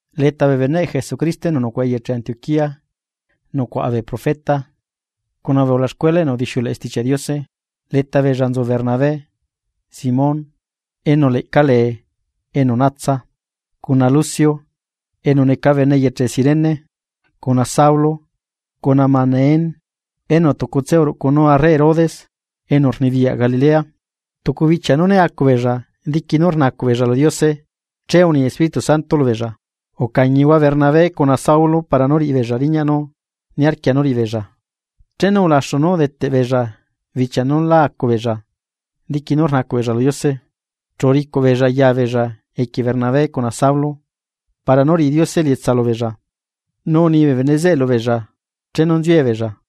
Leta beneꞌ Jesucristo enu nucuaꞌa eyeche Antioquía nucuaꞌa bee profeta, cuna bee ulaxcuela enu udixiuleꞌe Stichiaꞌ Diose. Leta beella nzu Bernabé, Simón (enu leꞌca lee enu natsa), cuna Lucio enu neca bene eyeche Cirene, cuna Saulo cuna Manaén (enu tucutse uruꞌcunu arre Herodes enu unibiyaꞌ Galilea). Tucu bichia nú né acu beella diqui nú rnacuꞌ beella lu Diose, che uni Espíritu Santo lubeella: ―Ucañihua Bernabé cuna Saulo para nú riꞌibeella riñaꞌ nú niarquia nú riꞌibeella. Chenu ulaxu nú udeteꞌbeella bichia nú la acu beella, diqui nú rnacuꞌ beella lu Diose, chu uricuꞌ beella ya beella equie Bernabé cuna Saulo para nú riꞌi Diose elietsa lubeella, nu uni bee bene zeꞌe lubeella chenu nziue beella.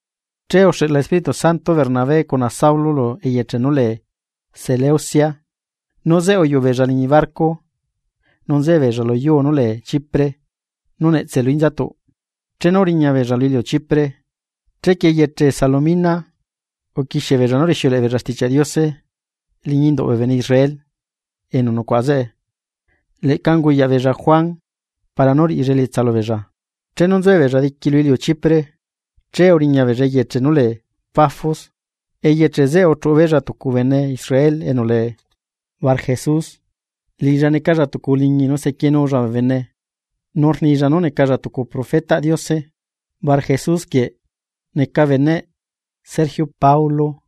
Che uxeꞌla Espíritu Santo Bernabé cuna Saulo lu eyeche nú lee Seleucia. Nu zeꞌe uyuꞌu beella liñi barco nu nzuella luyuu nú lee chipre nú netse lu inzatuꞌ. Chenu uriña beella lu iliu Chipre, chequie eyeche Salomina uquiexie beella nú rixiuleꞌe beella Stichiaꞌ Diose liñi induꞌ bee bene Israel enu nucuaꞌa zeꞌe, leꞌca unguyaꞌ beella Juan para nú riꞌilla elietsa lubeella. Chenu nzuebeella diqui lu iliu Chipre, che uriña beella eyeche nú lee Pafos, eyeche zeꞌe uchuꞌu beella tucu bene Israel enu lee Barjesus, liꞌilla necalla tucu uliñi nu sequienulla bee bene nu rnilla nú necalla tucu profetaꞌ Diose. Barjesus quieꞌ neca beneꞌ Sergio Paulo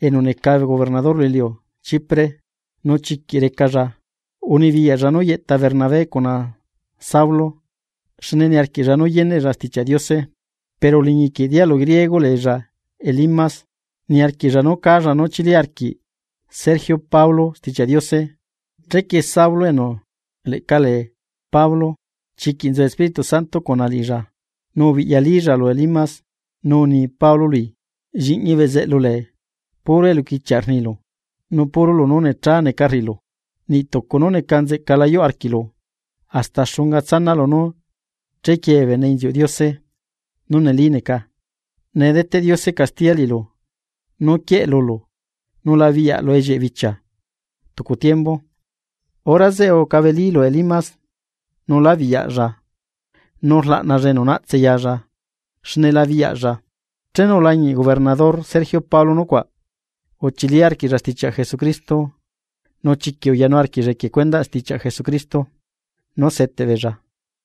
enu neca gobernador lu iliu Chipre, nu chiquiꞌ recalla. Unibiyaꞌlla nú yeꞌta Bernabé cuna Saulo, xne niarquiꞌlla nu yeneꞌlla Stichiaꞌ Diose. Pero uliñi quieꞌ dialu griego leella Elimas, niarquiꞌlla nú cálla nú chili arquiꞌ Sergio Paulo Stichiaꞌ Diose. Chequie Saulo enu leꞌca lee Pablo, chiquiꞌ nzu Espíritu Santo cuna liꞌilla, nu ubiꞌyalílla lu Elimas, nu uni Pablo lu Elimas: ―¡Lliꞌñi bezeꞌlu lee, puro eluquichiaꞌ rnilu, nu puro lunú necha neca rriꞌilu, niꞌ tucu nú neca nzeꞌca la yuꞌ arquiꞌlu! ¿Hasta xunga tsanaꞌlu nú chequiee bee bene inziuꞌ Diose nú neli neca? Nee deteꞌ Diose castiya liꞌilu nu quieꞌ lulu, nu la biꞌyaꞌlu ellieꞌe bichia tucu tiembu. Hora zeꞌe ucabelí lu Elimas nu la biyaꞌilla nu rlaꞌnalla enu naꞌtse yalla, xne la biꞌyaꞌlla. Chenu ulañiꞌ gobernador Sergio Paulo nucuaꞌ, uchili arquiꞌlla stichiaꞌ Jesucristo. Nu chiquiꞌ uyanuu arquiꞌlla equie cuendaꞌ stichiaꞌ Jesucristo nú seteꞌ beella.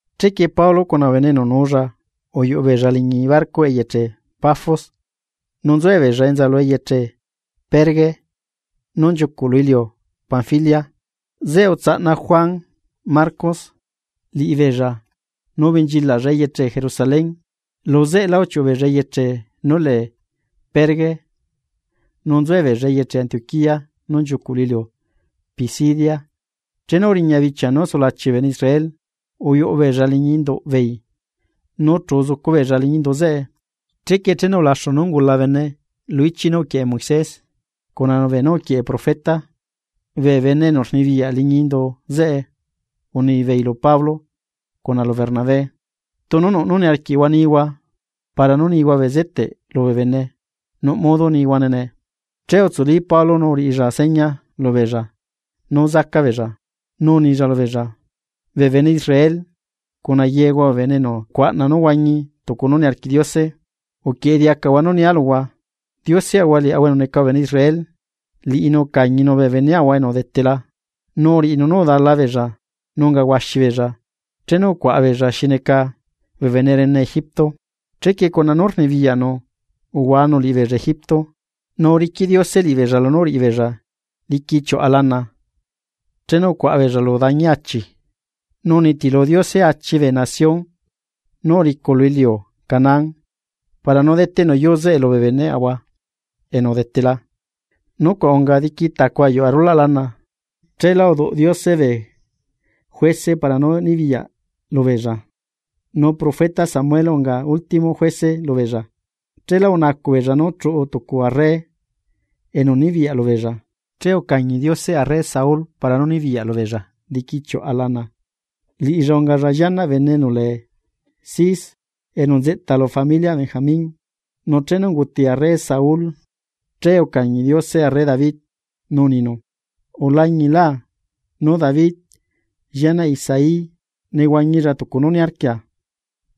Chequie Pablo cuna bee bene enu nuulla uyuꞌu beella liñi barco eyeche Pafos nu nzuebeella enza lu eyeche Perge nú nchiucuꞌ lu iliu Panfilia. Zeꞌe utsaꞌna Juan Marcos liꞌibeella nu ubenchilaꞌlla eyeche Jerusalén. Lu zeꞌelá uchiuꞌu beella eyeche nú lee Perge nu nzuebeella eyeche Antioquía nú nchiucu lu iliu Pisidia. Chenu uriña bichia nú sulachi bee bene Israel, uyuꞌu beella liñi induꞌ beei nu chu uzucu beella liñi indu zeꞌe. Chequie chenu ulaxu nú ungula bene lu ichiꞌ nú uquieꞌe Moisés cuna beenú uquieꞌe bee profeta, bee bene enu rnibiyaꞌ liñi indu zeꞌe unibeei lu Pablo cuna lu Bernabé: ―Tunu nuꞌ nú niarquiꞌhua nihua para nú nihua bezeteꞌ lubee bene nuꞌ modo nihuane nee. Che utsuli Pablo nu uriꞌilla seña lubeella nú zaca beella, nu unilla lubeella: ―Bee bene Israel, cuna yehua bee enu rcuaꞌna nú huañi tucu nú niarquiꞌ Diose, uquieꞌe diacahua nú nia luhua. Dioseꞌahua liaꞌahua enu neca bee bene Israel, liꞌinu ucañinu bee beneꞌahua enu udetela, nu uriꞌinu nú udala beella nu unga huaxi beella chenu ucuaꞌa beella xi neca bee bene rene Egipto, chequie cuna poderꞌnu uhuanu liꞌibeella Egipto. Nu uriquiꞌ Diose liꞌibeella lunú uriꞌibeella diqui chiuꞌa lana chenu ucuaꞌa beella lu dañi achi, nu unitilu Diose achi bee nación nú uricu lu iliu Canaán para nú udeteꞌnu yuu zeꞌe lubee beneꞌahua enu udetela. Nucuaꞌ unga diqui tacu ayuꞌu arulaꞌ lana, cheelá uduꞌ Diose bee juece para nú nibiyaꞌ lubeella. Nu profeta Samuel unga último juece lubeella. Cheelá unacuꞌ beella nú chuꞌu tucu arre enu nibiyaꞌ lubeella, che ucañi Diose arre Saul para nú nibiyaꞌ lubeella diqui chiuꞌa lana, liꞌilla ungalla llianaꞌ bene enu lee Cis, enu nzeꞌta leta familiꞌ Benjamin. Nu chenu unguti arre Saúl, che ucañi Diose arre David, nu uninu: “Ulañilá nú David, llianaꞌ Isaí nehuañilla tucu nú niarquia,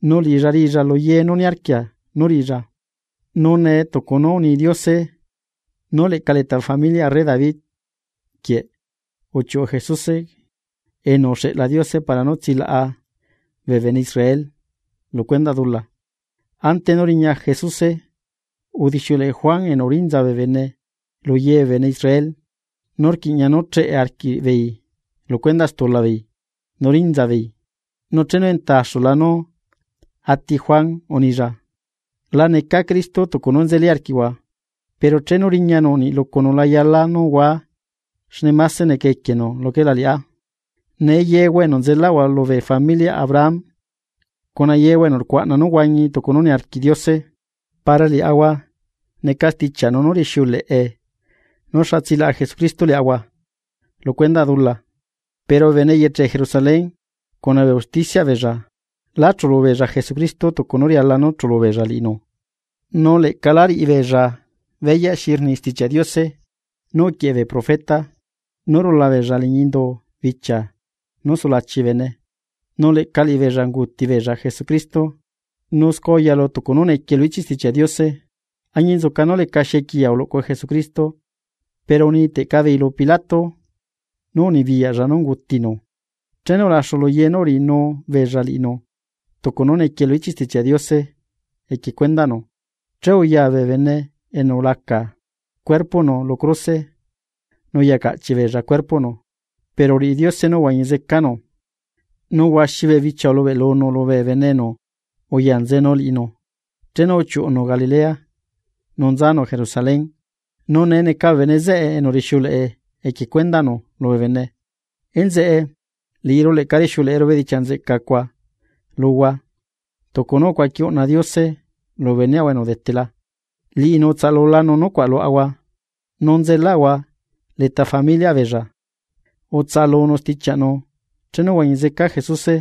nu liꞌilla riꞌilla lu ye nú niarquia nú riꞌilla.” Nu nee, tucu nú uni Diose nú leꞌca leta bee familiꞌ arre David quieꞌ uchiuꞌu Jesuse enu uxeꞌla Diose para nú tsilaꞌanu bee bene Israel lu cuendaꞌ stula beella. Ante nú riña Jesuse, udixiuleꞌe Juan Bautista lu ye bee bene Israel nú rquiꞌña nú cheꞌe arquiꞌbeei lu stula beei, nu rinza beei. Nu chenu nzeꞌta axula nú ati Juan, unilla: “La necá Cristo tucu nú nzeli arquiꞌhua. Pero chenu riñanu niꞌ lucunu la yala nú hua xne máse neca equienu luquela liꞌá.” ’Nee yeꞌahua enu nzelaꞌahua lubee familiꞌ Abraham, cuna yehua enu rcuaꞌna nú huañihua tucu nú niarquiꞌ Diose para liaꞌahua neca stichiaꞌnu nú rixiuleꞌe nú xa tsilaꞌa Jesucristo liaꞌahua lu cuendaꞌ dula. Pero bee bene eyeche Jerusalén cuna bee usticiaꞌ beella lá chulubeella Jesucristo tucu nú riala nú chulu beella liꞌinu nu leꞌca la riꞌibeella beyaꞌ xi rni Stichiaꞌ Diose nú uquieꞌe bee profeta nú rula beella liñi indu bichia nú sulachi beella nu leꞌca liꞌibeella unguti beella Jesucristo. Nu scua uyalu tucu nú niquie lu ichiꞌ Stichiaꞌ Diose. Añinzuca nú lecaxi equiya uluꞌcu Jesucristo, pero uniteꞌca beei lu Pilato nú unibiyaꞌlla nú ungutinu. Chenu ulaxu luye nú uriꞌinubeella liꞌinu tucu nú nequiee lu ichiꞌ Stichiaꞌ Diose equie cuendaꞌnu. Che uya bee bene enu ulaca cuerpoꞌnu lu cruse nu uyacaꞌchiꞌ beella cuerpoꞌnu. Pero uriꞌi Diose nú uhuañi zecanu. Nu huaxi bee bichia ulubeꞌlunu lubee bene enu uyanzenu liꞌinu chenu uchiuꞌunu Galilea nu nzanu Jerusalén, nu nee neca bee bene zeꞌe enu rixiuleꞌe equie cuendaꞌnu lubee bene. ’Enzeꞌe, liꞌiru leꞌca rixiuleꞌeru bedichiaꞌ nzeꞌca cuaꞌ luhua tucu nú ucuaqui uꞌna Diose lubee beneꞌahua enu udetela. Liꞌinu utsaꞌalulanu nucuaꞌ luaꞌahua nu nzelaꞌahua leta familiꞌ beella, utsaꞌalunu stichiaꞌnu chenu uhuañi zeca Jesuse,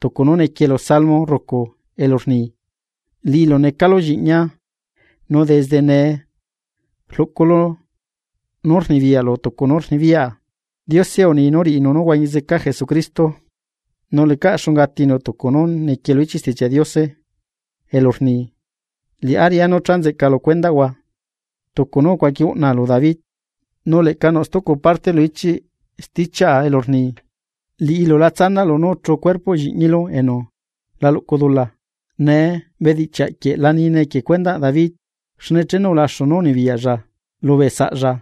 tucu nú niquie lu salmo rrucu elu rni: “Liꞌilu necalu Lliꞌñia nu desde nee rluꞌculu nú rnibiyaꞌlu tucu nú rnibiyaꞌa.” Diose uni nú riꞌinu nú huañi zeca Jesucristo, nu lecaꞌ xunga atinu tucu nú niquie lu ichiꞌ Stichiaꞌ Diose elu rni: “Liꞌá riꞌá nú cha nzeꞌca lu cuendaꞌhua tucu nú ucuaqui uꞌnaa lu David.” Nu leꞌca nuꞌ stucu parte lu ichiꞌ stichiaꞌa elu rni: “Liꞌilu la tsanaꞌlu nú uchu cuerpoꞌ Lliꞌñilu enu la luꞌcu dula.” Nee, bedichiaꞌ quieꞌ la nine equie cuendaꞌ David, xne chenu ulaxu nú unibiyaꞌlla lubee saꞌlla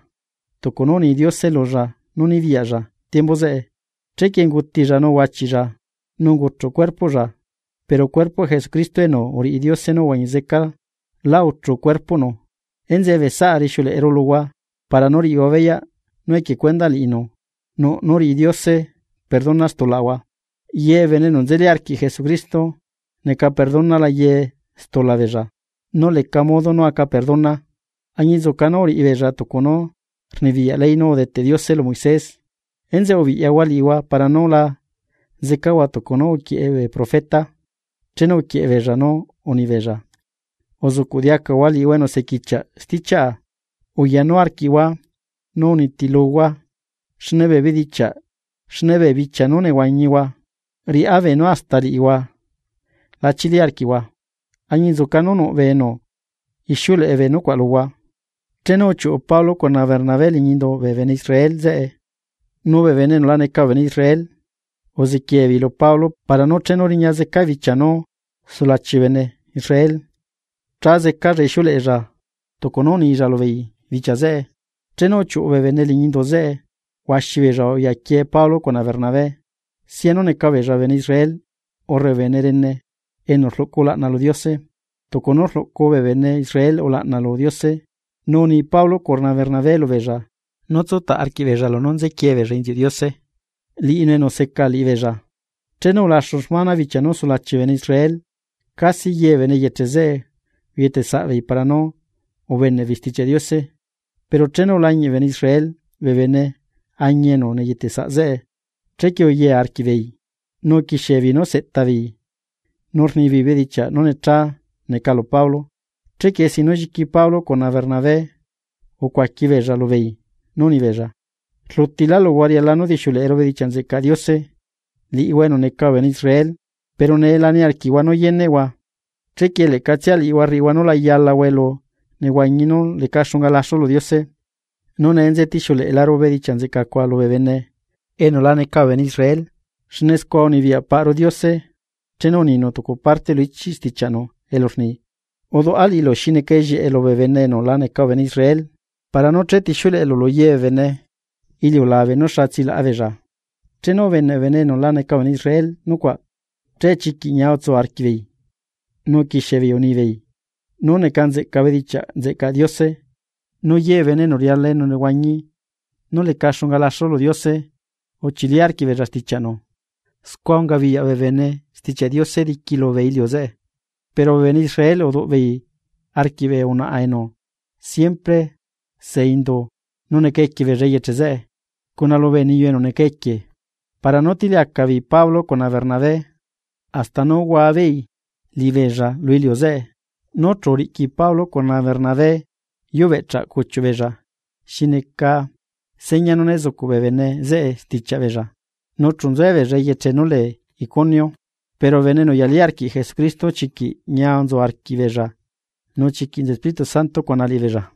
tucu nú uni Diose lulla nú nibiyaꞌlla tiembu zeꞌe, chequie ungutilla nu uhuachiꞌlla nu unguchuꞌ cuerpoꞌlla. Pero cuerpoꞌ Jesucristo enu uriꞌi Diose nú uhuañi zeca, lá uchu cuerpoꞌnu. Enzeꞌe bee saꞌa, rixiuleꞌeru luhua para nú riꞌihua beyaꞌ nú equie cuendaꞌ liꞌinu nuꞌ nú rriꞌi Diose perdona stulaꞌahua. Ye bee bene enu nzeli arquiꞌ Jesucristo neca perdonala ye stula beella nú leca modo nú aca perdona, añinzuca nú uriꞌibeella tucu nú rnibiyaꞌ ley nú udeteꞌ Diose lu Moisés. Enzeꞌe ubiꞌyahua liꞌihua para nú la zecahua tucu nú uquieꞌe bee profeta, chenu uquieꞌe beella nú unibeella: Uzuꞌcuꞌ diacahua liꞌihua enu sequichiaꞌ stichiaꞌa. Uyanu arquiꞌhua nú unitiluhua, xne bee bichia nú nehuañihua riꞌá beenu hasta liꞌihua la chili arquiꞌhua, añinzuca nú nuꞌ bee enu, ixiuleꞌe bee nucuaꞌ luhua. Chenu uchiuꞌu Pablo cuna Bernabé liñi induꞌ bee bene Israel zeꞌe, nu bee bene enu la neca bee bene Israel uziquiee beei lu Pablo para nú chenu riña zeca bichia nú sulachi bee bene Israel cha zecalla ixiuleꞌella tucu nú unilla lubeei bichia zeꞌe. Chenu uchiuꞌu bee bene liñi indu zeꞌe huaxi beella uyaquie Pablo cuna Bernabé, sianu neca beella bee bene Israel urre bee bene rene enu rluꞌcu ulaꞌna lu Diose, tucu nú rluꞌcu bee bene Israel ulaꞌna lu Diose. Nu uni Pablo cuna Bernabé lubeella nú tsútaꞌ arquiꞌbeella lunú nziquie beella inziuꞌ Diose liꞌinu enu seca liꞌibeella. Chenu ulaxu xmana, bichia nú sulachi bee bene Israel, casi ye bee bene eyeche zeꞌe uyetesaꞌbeei para nú ubeneꞌ beei Stichiaꞌ Diose. Pero chenu ulañiꞌ bee bene Israel bee beneañi enu neyeteꞌsaꞌ zeꞌe, chequie uyee arquiꞌbeei nu uquixiebeei nú seꞌta beei nú rnibeei bedichiaꞌ nú necha neca lu Pablo. Chequie sin nú lliqui Pablo cuna Bernabé ucuaqui beella lubeei nú unibeella: ―Rlutilá luhua riala nú dixiuleꞌeru bedichiaꞌ nzeꞌcaꞌ Diose, liꞌihua enu neca bee bene Israel, pero nee la niarquiꞌhua nú yeneꞌhuane, chequie leꞌcatsia liꞌihua rriꞌihua nú la yalahua elu nehuañi nú leca xunga laxu lu Diose. Nu nee nze tixiuleꞌeru bedichiaꞌ nzeꞌca cuaꞌ lubee bene enu la neca bee bene Israel. Xne scua unibiyaꞌ paꞌru Diose chenu uninu tucu parte lu stichiaꞌnu elu rni: Uduꞌa liꞌilu xi neca ellieꞌe lubee bene enu la neca bee bene Israel, para nú chetixiuleꞌelu lu ye bee bene iliulabe nú xa tsilaꞌa beella. Chenu ubeneꞌ bee bene enu la neca bee bene Israel nucuaꞌ, che chiquiꞌ ñia utsu arquiꞌbeei nu uquixiebeei unibeei nú neca nzeꞌca bedichiaꞌ nzeꞌcaꞌ Diose. Nu ye bee bene enu riala elunehuañi nú leca xunga laxu lu Diose uchili arquiꞌbeella stichiaꞌnu. Scua ungabiyaꞌ bee bene Stichiaꞌ Diose diqui lubee iliu zeꞌe. Pero bee bene Israel uduꞌ beei arquiꞌ bee unaꞌa enu siempre se indu nu neca equie beella eyeche zeꞌe, cuna lubee niyu enu neca equie para nú utiliacaꞌ beei Pablo cuna Bernabé hasta nú uhuabeei liꞌibeella lu iliu zeꞌe. Nu chu uriꞌqui Pablo cuna Bernabé yu beꞌchaꞌ cuchiuꞌ beella xi neca seña nú ne zucuꞌ bee bene zeꞌe stichiaꞌ beella, nu chu nzuebeella eyeche nú lee Iconio. Pero bee bene enu uyalí arquiꞌ Jesucristo chiquiꞌ ñia nzu arquiꞌbeella nu chiquiꞌ nzu Espíritu Santo cuna liꞌibeella.